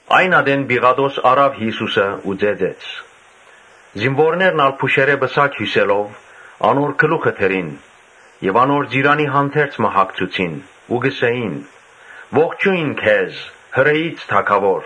Այն ատեն Պիղատոս առաւ Յիսուսը ու ծեծեց։ Զինուորներն ալ փուշերէ պսակ հիւսելով՝ անոր գլուխը դրին եւ անոր ծիրանի հանդերձ մը հագցուցին. Ու կ’ըսէին. «Ողջո՜յն քեզ, Հրէի՛ց թագաւոր»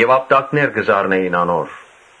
եւ ապտակներ կը զարնէին անոր։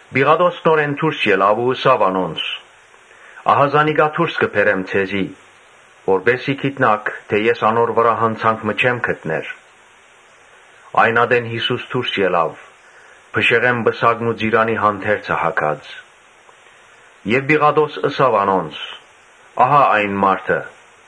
Պիղատոս նորէն դուրս ելաւ ու ըսաւ անոնց. «Ահա զանիկա դուրս կը բերեմ ձեզի, որպէս զի գիտնաք թէ ես անոր վրայ յանցանք մը չեմ գտներ»։ Այն ատեն Յիսուս դուրս ելաւ՝ փշեղէն պսակն ու ծիրանի հանդերձը հագած եւ Պիղատոս ըսաւ անոնց. «Ահա՛ այն մարդը»։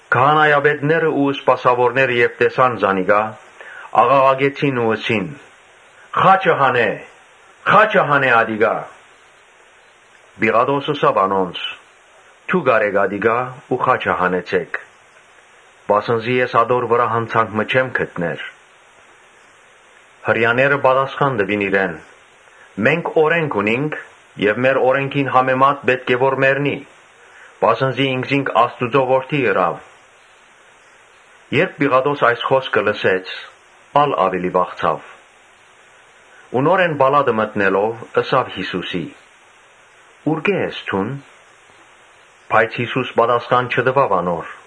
Քահանայապետներն ու սպասաւորները երբ տեսան զանիկա, աղաղակեցին ու ըսին. «Խա՛չը հանէ, խա՛չը հանէ [ատիկա]»։ Պիղատոս ըսաւ անոնց. «Դո՛ւք առէք ատիկա ու խաչը հանեցէք, վասն զի ես ատոր վրայ յանցանք մը չեմ գտներ»։ Հրեաները պատասխան տուին իրեն. «Մենք օրէնք ունինք եւ մեր օրէնքին համեմատ պէտք է որ մեռնի, վասն զի ինքզինք Աստուծոյ Որդի ըրաւ»։ Երբ Պիղատոս այս խօսքը լսեց, ա՛լ աւելի վախցաւ։ Ու նորէն պալատը մտնելով՝ ըսաւ Յիսուսին «Ուրկէ՞ ես դուն»։ Բայց Յիսուս պատասխան չտուաւ անոր։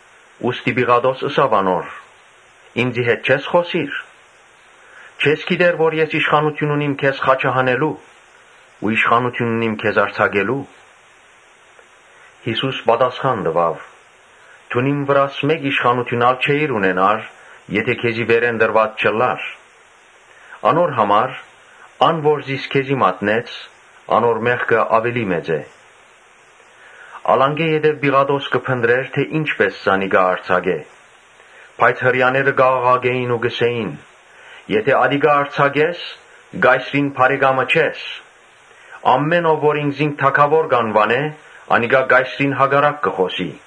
Ուստի Պիղատոս ըսաւ անոր. «Ինծի հետ չե՞ս խօսիր. չե՞ս գիտեր թէ ես իշխանութիւն ունիմ քեզ խաչը հանելու ու իշխանութիւն ունիմ քեզ արձակելու»։ Յիսուս պատասխան տուաւ. «Դուն իմ վրաս իշխանութիւն մըն ալ չէիր ունենար, եթէ քեզի վերէն տրուած չըլլար։ Անոր համար՝ ան որ զիս քեզի մատնեց, անոր մեղքը աւելի մեծ է»։ Անկէ յետոյ Պիղատոս կը փնտռէր թէ ի՛նչպէս զանիկա արձակէ. բայց Հրեաները կ’աղաղակէին ու կ’ըսէին. «Եթէ ատիկա արձակես, կայսրին բարեկամը չես. ամէն ով որ ինքզինք թագաւոր կ’անուանէ, անիկա Կայսրին հակառակ կը խօսի»։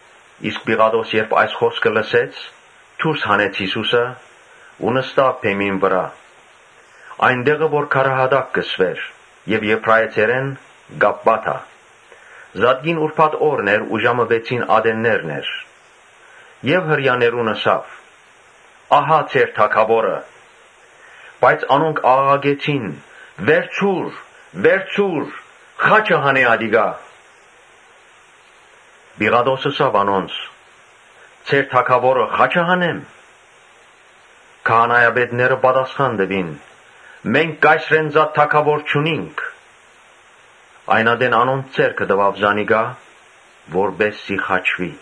Իսկ Պիղատոս, երբ այս խօսքը լսեց, դուրս հանեց Յիսուսը ու նստաւ բեմին վրայ, այն տեղը որ Քարայատակ կը կոչուէր եւ Եբրայեցերէն՝ Կապպաթա. (Զատկին ուրբաթ օրն էր ու ժամը վեցին ատեններն էր.) եւ Հրեաներուն ըսաւ. «Ահա ձեր թագաւորը»։ Բայց անոնք աղաղակեցին. «Վերցո՛ւր, վերցո՛ւր, խա՛չը հանէ ատիկա»։ Պիղատոս ըսաւ անոնց. «Ձեր թագաւորը խա՞չը հանեմ»։ Քահանայապետները պատասխան տուին. «Մենք կայսրէն զատ թագաւոր չունինք»։ Այն ատեն անոնց ձեռքը տուաւ զանիկա, որպէս զի խաչուի։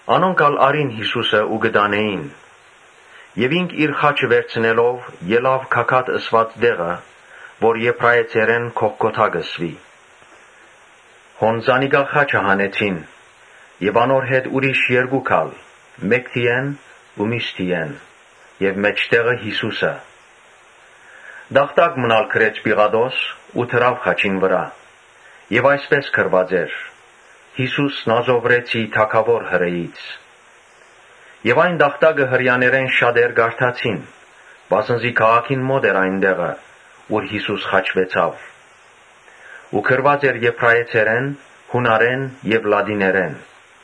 Անոնք ալ առին Յիսուսը ու կը տանէին. Յիսուս իր խաչը վերցնելով՝ ելաւ գագաթ ըսուած տեղը, որ Եբրայեցերէն Գողգոթա կը կոչուի։ Հոն զանիկա խաչը հանեցին եւ անոր հետ ուրիշ երկուք ալ՝ ամէն մէկը մէկ կողմը եւ մէջտեղը Յիսուսը։ Տախտակ մըն ալ գրեց Պիղատոս ու դրաւ խաչին վրայ, ուր այսպէս գրուած էր. «Յիսուս Նազովրեցի՝ Թագաւոր Հրեաներու»։ Եւ տախտակը Հրեաներէն շատեր կարդացին, վասն զի քաղաքին մօտ էր այն տեղը՝ ուր Յիսուս խաչուեցաւ ու գրուած էր Եբրայեցերէն, Յունարէն եւ Լատիներէն։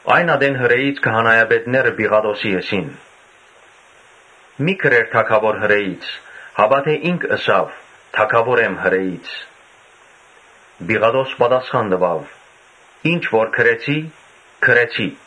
Այն ատեն Հրէից քահանայապետները Պիղատոսին ըսին. «Մի՛ գրեր Թագաւոր Հրեաներու, հապա թէ՝ ‘Ինք ըսաւ, Թագաւոր եմ Հրեաներու’»։ Պիղատոս պատասխան տուաւ. «Ինչ որ գրեցի՝ գրեցի»։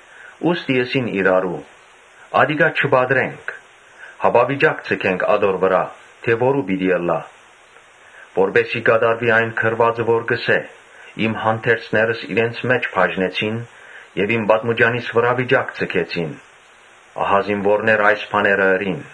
Ուստի ըսին իրարու. «Ատիկա չպատռենք, հապա վիճակ ձգենք ատոր վրայ, թէ որո՞ւ պիտի ըլլայ». որպէս զի կատարուի այն գրուածը որ կ’ըսէ. «Իմ հանդերձներս իրենց մէջ բաժնեցին եւ իմ պատմուճանիս վրայ վիճակ ձգեցին»։ Ահա զինուորները այս բաները ըրին։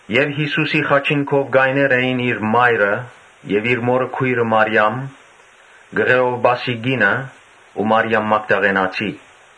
Յիսուսին խաչին քով կայներ էին իր մայրը եւ իր մօրը քոյրը՝ Մարիամ, Կղէովպասի կինը ու Մարիամ Մագդաղենացին։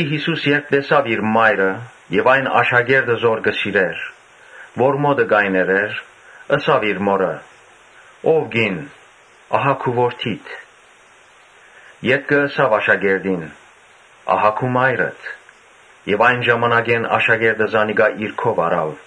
Յիսուս երբ տեսաւ իր մայրը եւ այն աշակերտը որ կը սիրէր, որ մօտը կայներ էր, ըսաւ իր մօրը. «Ո՛վ կին, ահա քու որդիդ»։ Ետքը ըսաւ աշակերտին. «Ահա՛ քու մայրդ»։ Եւ այն ժամանակէն աշակերտը զանիկա իր քով առաւ։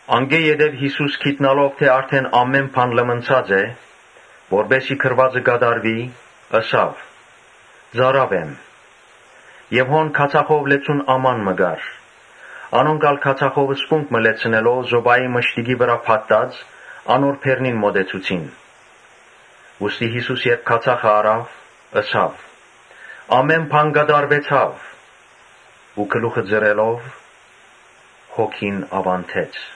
Անկէ ետք, Յիսուս գիտնալով թէ արդէն ամէն բան լմնցած է, (որպէս զի գրուածը կատարուի,) ըսաւ. «Ծարաւ եմ»։ Եւ հոն քացախով լեցուն աման մը կար. անոնք քացախով սպունգ մը լեցնելով զոպայի մշտիկի վրայ փաթթուած՝ անոր բերնին մօտեցուցին։ Ուստի Յիսուս երբ քացախը առաւ՝ ըսաւ. «Ամէն բան կատարուեցաւ» ու գլուխը ծռելով՝ հոգին աւանդեց։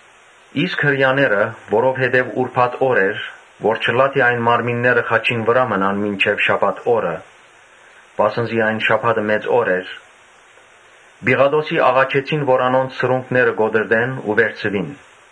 Այն ատեն Հրեաները, որովհետեւ ուրբաթ օր էր եւ որպէս զի այն մարմինները խաչին վրայ չմնան մինչեւ շաբաթ օրը, (վասն զի այն շաբաթը մեծ օր էր,) Պիղատոսին աղաչեցին, որ անոնց սրունքները կոտրտեն ու վերցուին։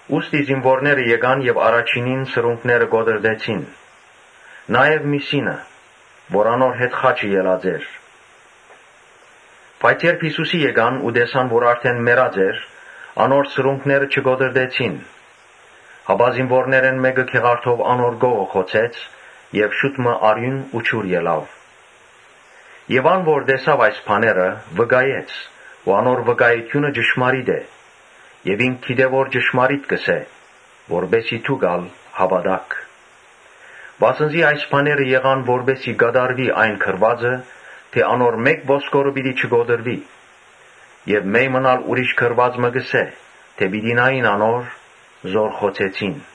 Զինուորները եկան ու առաջինին սրունքները կոտրտեցին, նաեւ միւսինը՝ որ անոր հետ խաչը ելած էր։ Բայց երբ Յիսուսին մօտեցան ու տեսան թէ արդէն մեռած էր, անոր սրունքները չկոտրտեցին. Բայց զինուորներէն մէկը գեղարդով անոր կողը խոցեց եւ շուտ մը արիւն ու ջուր ելաւ։ Եւ ան որ տեսաւ այս բաները՝ վկայեց ու անոր վկայութիւնը ճշմարիտ է եւ ինք գիտէ թէ ճշմարիտը կ’ըսէ, որպէս զի դուք [ալ] հաւատաք։ Վասն զի այս բաները եղան որպէս զի կատարուի այն գրուածը թէ՝ «Անոր մէ՛կ ոսկորը պիտի չկոտրուի»։ Ուրիշ գրուած մը կ’ըսէ թէ՝ «Պիտի նային անոր՝ որ խոցեցին»։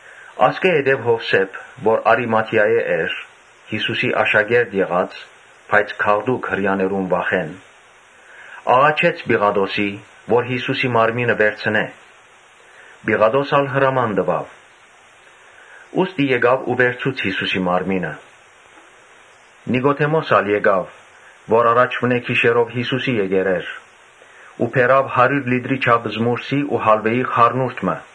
Ասկէ ետք Յովսէփ, որ Արիմաթիայէն էր, (Յիսուսի աշակերտը եղած՝ բայց գաղտուկ՝ Հրեաներուն վախէն,) խնդրեց Պիղատոսէն որ Յիսուսին մարմինը վերցնէ։ Պիղատոս ալ հրաման տուաւ. ուստի եկաւ, վերցուց Յիսուսին մարմինը։ Նիկոդէմոս ալ եկաւ (որ առաջուընէ գիշերով իր քով եկեր էր,) ու բերաւ հարիւր լիտրի չափ զմուռսի ու հալուէի խառնուրդ մը։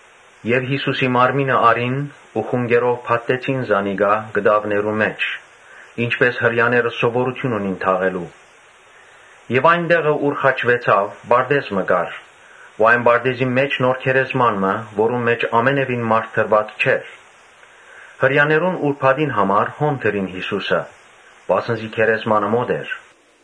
Յիսուսին մարմինը առին, խունկերով փաթթեցին զանիկա կտաւներու մէջ, ինչպէս Հրեաները սովորութիւն ունին։ Այն տեղը, ուր խաչուեցաւ, պարտէզ մը կար ու այն պարտէզին մէջ նոր գերեզման մը, որուն մէջ ամենեւին մարդ դրուած չէր։ Հրեաներուն ուրբաթին համար հոն դրին Յիսուսը, վասն զի գերեզմանը մօտ էր։